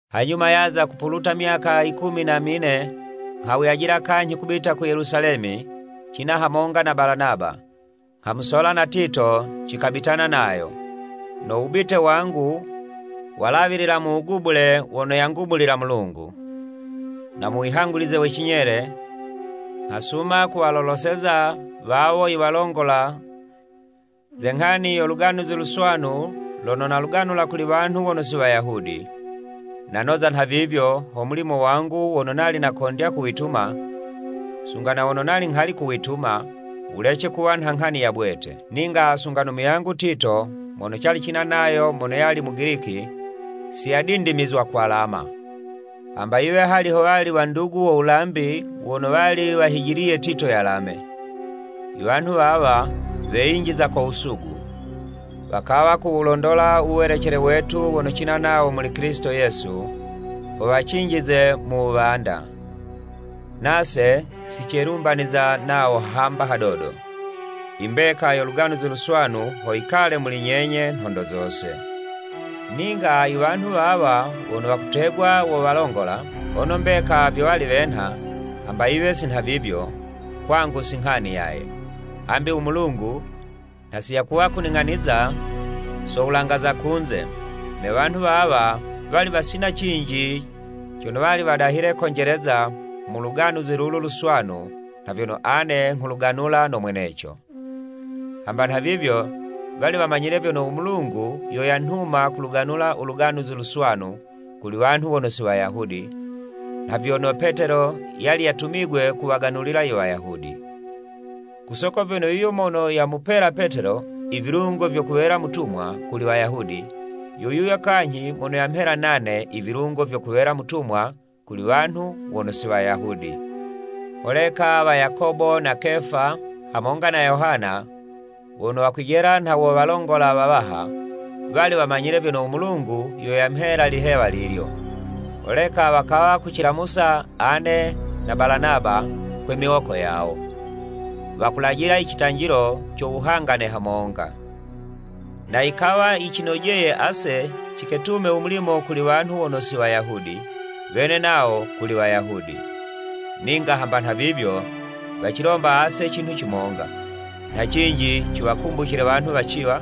Hanyuma yaza kupuluta myaka yikumi na mine, nghawuyajila kanyhi kubita ku Yelusalemi cina hamonga na Balanaba, nghamusola na Tito cikabitana nayo. No wubite wangu walawilila mu wugubule wono yangubulila Mulungu. Na muwihangulize we cinyele, nghasuma kuwaloloseza wawo iwalongola ze nghani yo Luganuzi Luswanu lono naluganula kuli wanhu wono si Wayahudi. Nanoza nhavivyo ho mulimo wangu wono nali nakondya kuwituma, sunga na wono nali nghali kuwituma, wulece kuwa nha nghani ya bwete. Ninga sunga no muyangu Tito mono cali cina nayo mono yali Mugiliki, si yadindimizwa kwalama, hamba yiwe hali howali wandugu wo wulambi wono wali wahijiliye Tito yalame. I wanhu wawa weyinjiza ko wusugu, wakawa kuwulondola u welecele wetu wono cina nawo muli Kilisito Yesu, ho wacinjize mu wuwanda. Nase si celumbaniza nawo hamba hadodo, i mbeka yo Luganuzi Luswanu ho yikale muli nyenye nhondo zose. Ninga i wanhu wawa wono wakutegwa wo walongola, hono mbeka vyo wali wenha, hamba yiwe si nhavivyo, kwangu si nghani yaye, hambi u Mulungu nha siyakuwa kuling'aniza so wulanga za kunze, ne wanhu wawa wali wasina cinji cono wali wadahile konjeleza mu Luganuzi lulu Luswanu nha vyono ane nghuluganula no mweneco. Hamba nhavivyo, wali wamanyile vyono u Mulungu yo yanhuma kuluganula u Luganuzi Luswanu kuli wanhu wono si Wayahudi, nha vyono Petelo yali yatumigwe kuwaganulila i Wayahudi. Ku soko vyono yuyo mono yamupela Petelo i vilungo vyo kuwela mutumwa kuli Wayahudi, yo yuyo kanyhi mono yamhela nane i vilungo vyo kuwela mutumwa kuli wanhu wono si Wayahudi. Holeka wa Yakobo na Kefa hamonga na Yohana, wono wakwijela nha wo walongola wawaha, wali wamanyile vyono u Mulungu yo yamhela lihewa lilyo, holeka wakawa kucilamusa ane na Balanaba kwe miwoko yawo, wakulajila i citanjilo co wuhangane hamonga. Na yikawa yicinojeye ase ciketume u mulimo kuli wanhu wono si Wayahudi, wene nawo kuli Wayahudi. Ninga hamba nhavivyo, wacilomba ase cinhu cimonga, nha cinji ciwakumbucile wanhu waciwa,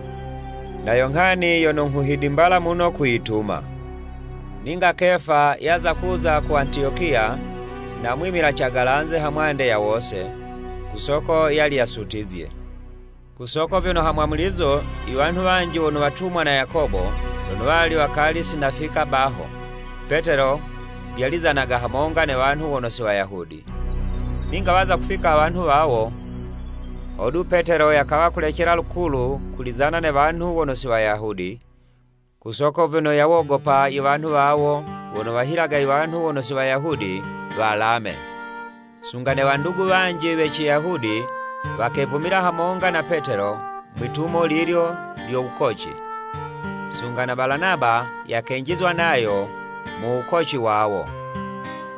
na yo nghani yono nghuhidimbala muno kuyituma. Ninga Kefa yaza kuza ku Antiyokiya, namwimila cagalanze hamwande ya wose, ku soko yali yasutizye. Ku soko vyono ha mwamulizo, i wanhu wanji wono watumwa na Yakobo, lono wali wakali si nafika baho, Petelo vyalizanaga hamonga ne wanhu wono si Wayahudi. Ninga waza kufika wanhu wawo, hodu Petelo yakawa kulecela lukulu kulizana ne wanhu wono si Wayahudi, ku soko vyono yawogopa i wanhu wawo wono wahilaga i wanhu wono si Wayahudi walame. Sunga ne wandugu wanji we Ciyahudi wakevumila hamonga na Petelo mwi'tumo lilyo lyo wukoci, sunga na Balanaba yakenjizwa nayo mu wukoci wawo.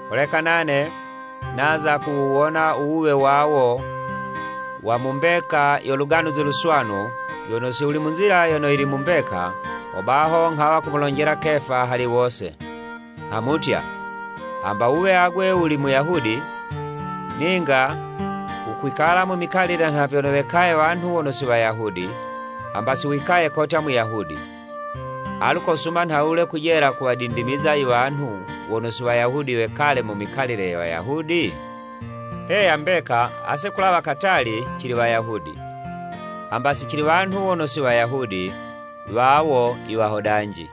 Holeka nane naza kuwuwona u wuwe wawo wa mu mbeka yo Luganuzi Luswanu, vyono si wuli mu nzila yono yili mu mbeka, hobaho nghawa kumulonjela Kefa hali wose, nghamutya, “Hamba wuwe agwe wuli Muyahudi, ninga wukwikala mu mikalile nha vyono wekaye wanhu wono si Wayahudi, hamba si wikaye kotya Muyahudi! Alu kosuma nhawule kujela kuwadindimiza i wanhu wono si Wayahudi wekale mu mikalile ye Wayahudi?” Heya mbeka, ase kulawa katali cili Wayahudi, hamba si cili wanhu we wono si Wayahudi, wawo i wahodanji!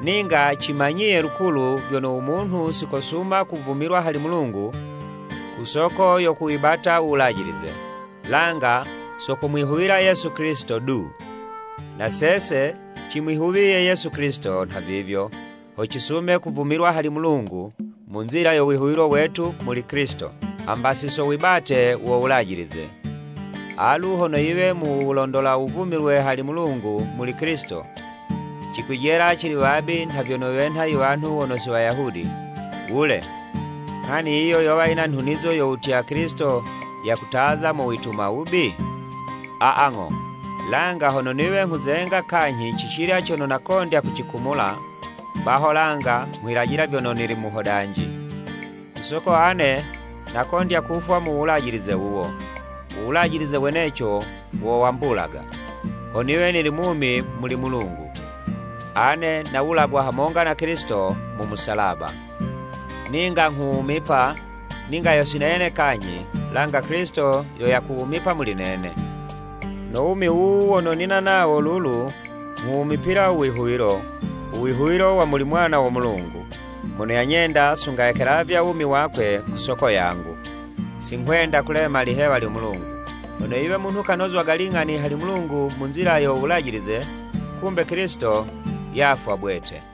Ninga cimanyiye lukulu vyono u munhu si kosuma kuvumilwa hali Mulungu ku soko yo kuwibata u Wulajilize, langa so kumwihuwila Yesu Kilisito du. Na sese cimwihuwiye Yesu Kilisito nhavivyo ho cisume kuvumilwa hali Mulungu mu nzila yo wihuwilo wetu kuli Kilisito, hamba si so wibate wo Wulajilize. Alu hono yiwe mu wulondola wuvumilwe hali Mulungu muli Kilisito, cikwijela cili wabi nha vyono wenha i wanhu wono si Wayahudi, wule! Nghani yiyo yowa yina nhunizo yo wutya Kilisito yakutaza mu wituma wubi? Aa ng'o! Langa hono niwe nghuzenga kanyhi cicilya cono nakondya kucikumula, baho langa nghwilajila vyono nili muhodanji. Ku soko ane nakondya kufwa mu Wulajilize wuwo, u Wulajilize weneco wo wambulaga, ho niwe nili mumi muli Mulungu. Ane nawulagwa hamonga na Kilisito mu musalaba, ninga nghuwumipa, ninga yo si nene kanyhi, langa Kilisito yo yakuwumipa muli nene. No wumi wuwu wono nina nawo lulu, nghuwumipila u wihuwilo, u wihuwilo wa muli Mwana wo Mulungu mono yanyenda sunga yakelavya wumi wakwe ku soko yangu. Si nghwenda kulema lihewa lyo Mulungu. Hono yiwe munhu kanozwaga ling'ani hali Mulungu mu nzila yo Wulajilize, kumbe Kilisito yafwa bwete.